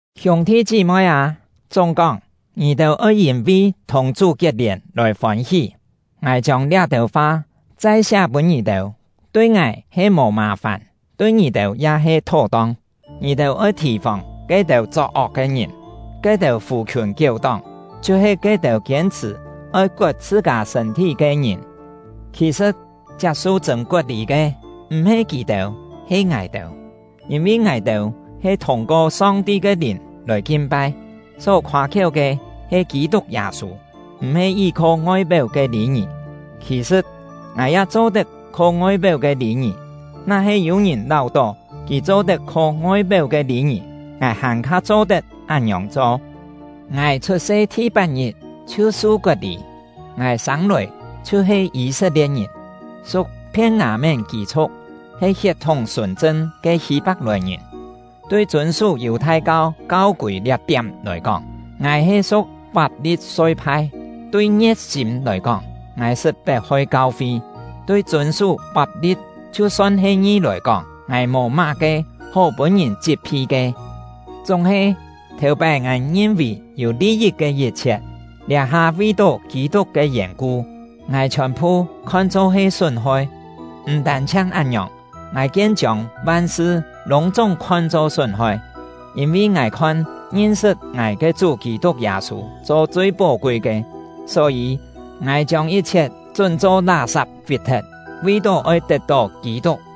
Hiûng-thi chí-moi â, chúng-kóng: Ngì-têu oi yîn-vi thùng Chú kiet-lièn lòi fôn-hí! Ngài chiông liá-têu fa chai siá pûn ngì-têu, tui ngài he mò mà-fàn, tui ngì-têu ya he thó-tong. Ngì-têu oi thì-fòng ke-têu chok-ok ke ngìn, ke-têu fù-khiùn kiéu-tóng, chhiu-he ke-têu kiên-chhṳ̀ oi kot chhṳ-kâ sṳ̂n-thí ke ngìn. Khì-sṳ̍t, chiap-su chṳ̂n kot-lî ke, m̀-he kì-têu, he ngài-têu; yîn-vi ngài-têu he thûng-ko Song-ti ke Lìn lòi kin-pai, só khoâ-khiéu ke he Kî-tuk Yâ-sû, m̀-he yí-kho ngoi-péu ke lî-ngì. Khì-sṳ̍t, ngài ya cho-tet kho ngoi-péu ke lî-ngì. Na-he yû-ngìn láu-tó kì cho-tet kho ngoi-péu ke lî-ngì, ngài hàn-kha cho-tet án-ngiòng cho. Ngài chhut-se thi-pat-ngit chhiu su kot-lî. Ngài sên-lòi chhiu he Yî-set-lie̍t-ngìn, su̍k Phien-ngâ-mén kî-chhu̍k, he hiet-thúng sùn-chṳn ke Hî-pak-lòi-ngìn. Tui chûn-sú Yù-thai-kau kau-kûi liá-tiám lòi kóng, ngài he su̍k Fap-li-soi-phai; tui ngie̍t-sîm lòi kóng, ngài sṳt pet-hoi kau-fi; tui chûn-sú fap-li̍t chhiu son he ngi lòi kóng, ngài mò má-ke hó pûn-ngìn chit-phi ke. Chúng-he, thèu-pái ngài ngin-vì yû li-yit ke yit-chhiet, liá-ha vi-tó Kî-tuk ke yèn-ku, ngài chhiòn-phu khon-cho he sún-hoi. M̀ tân-chhiang án-ngiòng, ngài kien chiông van-sṳ lûng-chúng khon-cho sún-hoi, yîn-vi ngài khon ngin-sṳt ngài ke Chú Kî-tuk Yâ-sû cho chui pó-kui ke. Só-yî, ngài chiông yit-chhiet chún-cho lá-sap fit-thet, vi-tó oi tet-tó Kî-tuk,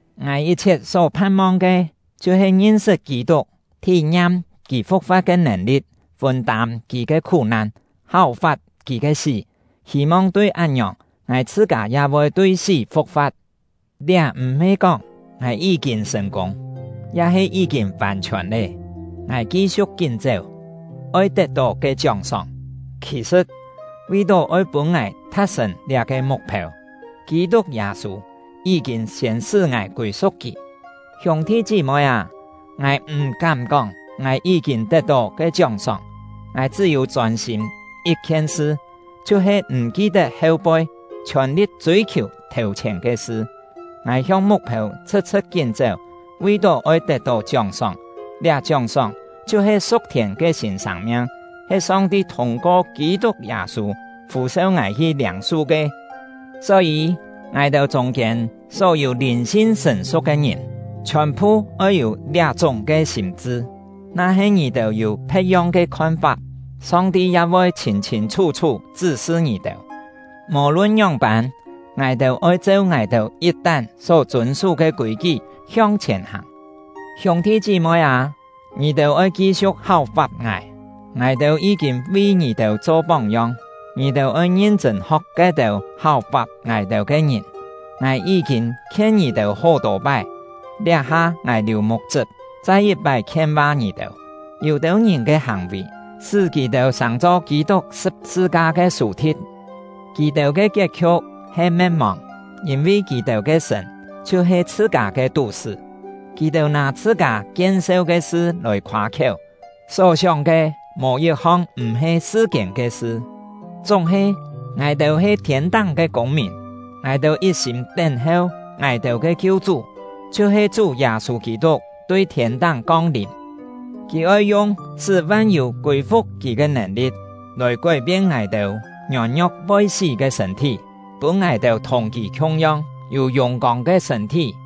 Ngài yit-chhiet só phan-mong ke chhiu-he ngin-sṳt Kî-tuk, thí-ngiam kì fu̍k-fa̍t ke nèn-li̍t, fûn-tâm kì ke khú-nan, háu-fap kì ke sí, hî-mong tui án-ngiòng ngài chhṳ-kâ ya voi tui sí fu̍k-fa̍t. Liá m̀-he kóng ngài yí-kîn sṳ̀n-kûng, ya-he yí-kîn vàn-chhiòn lé. Ngài ki-siu̍k kín chéu, oi tet-tó ke chióng-sóng; khì-sṳ̍t, vi-tó oi pûn ngài tha̍t-sṳ̀n liá-ke muk-phêu, Kî-tuk Yâ-sû yí-kîn siên sṳ́ ngài kûi-su̍k kì. Hiûng-thi chí-moi â, ngài m̀-kám kóng ngài yí-kîn tet-tó ke chióng-sóng; ngài chṳ́-yû chôn-sîm yit-khien sṳ: Chhiu-he m̀ ki-tet heu-poi, chhiòn-li̍t chûi-khiù thèu-chhièn ke sṳ. Ngài hiong muk-phêu chhṳ̍t-chhṳ̍t kín chéu, vi-tó oi tet-tó chióng-sóng; liá chióng-sóng chhiu-he su̍k-thiên ke sîn sâng-miang, he Song-ti thûng-ko Kî-tuk Yâ-sû fû-seu ngài hi liâng-su ke. Só-yî, ngài-têu chûng-kiên só-yû lìn-sin sṳ̀n-su̍k ke ngìn, chhiòn-phu oi yû liá-chúng ke sîm-chṳ; na-he ngì-têu yû phe̍t-yong ke khon-fap, Song-ti ya voi chhîn-chhîn chhú-chhú chṳ́-sṳ ngì-têu. Mò-lun ngióng-pân, ngài-têu oi cheu ngài-têu yit-tán só chûn-sú ke kûi-kí hiong-chhièn hàng. Hiûng-thi chí-moi â, ngì-têu oi ki-siu̍k háu-fap ngài. Ngài-têu yí-kîn vi ngì-têu cho póng-yong; ngì-têu oi ngin-chṳ̂n ho̍k ke-têu háu-fap ngài-têu ke ngìn. Ngài yí-kîn khien ngì-têu hó-tô pái, liá-ha ngài liù muk-chṳp chai yit-pái khien-va ngì-têu: Yû-têu ngìn ke hàng-vì sṳ́ kì-têu sàng-cho Kî-tuk sṳ̍p-sṳ-ka ke sù-thi̍t. Kì-têu ke kiet-khiu̍k he me̍t-mòng, yîn-vi kì-têu ke sṳ̀n chhiu-he chhṳ-kâ ke tú-sṳ́. Kì-têu nâ chhṳ-kâ kien-seu ke sṳ lòi khoâ-khiéu, só sióng ke mò yit-hong m̀-he sṳ-kiên ke sṳ. Chúng-he, ngài-têu he thiên-táng ke kûng-mìn; ngài-têu yit-sîm tén-heu ngài-têu ke Kiu-chú, chhiu-he Chú Yâ-sû Kî-tuk tui thiên-táng kong-lìm. Kì oi yung sṳ́ van-yû kûi-fu̍k kì ke nèn-li̍t, lòi kói-pien ngài-têu ngiôn-ngio̍k voi sí ke sṳ̂n-thí, pûn ngài-têu thùng kì khiung-yong, yû yùng-kông ke sṳ̂n-thí.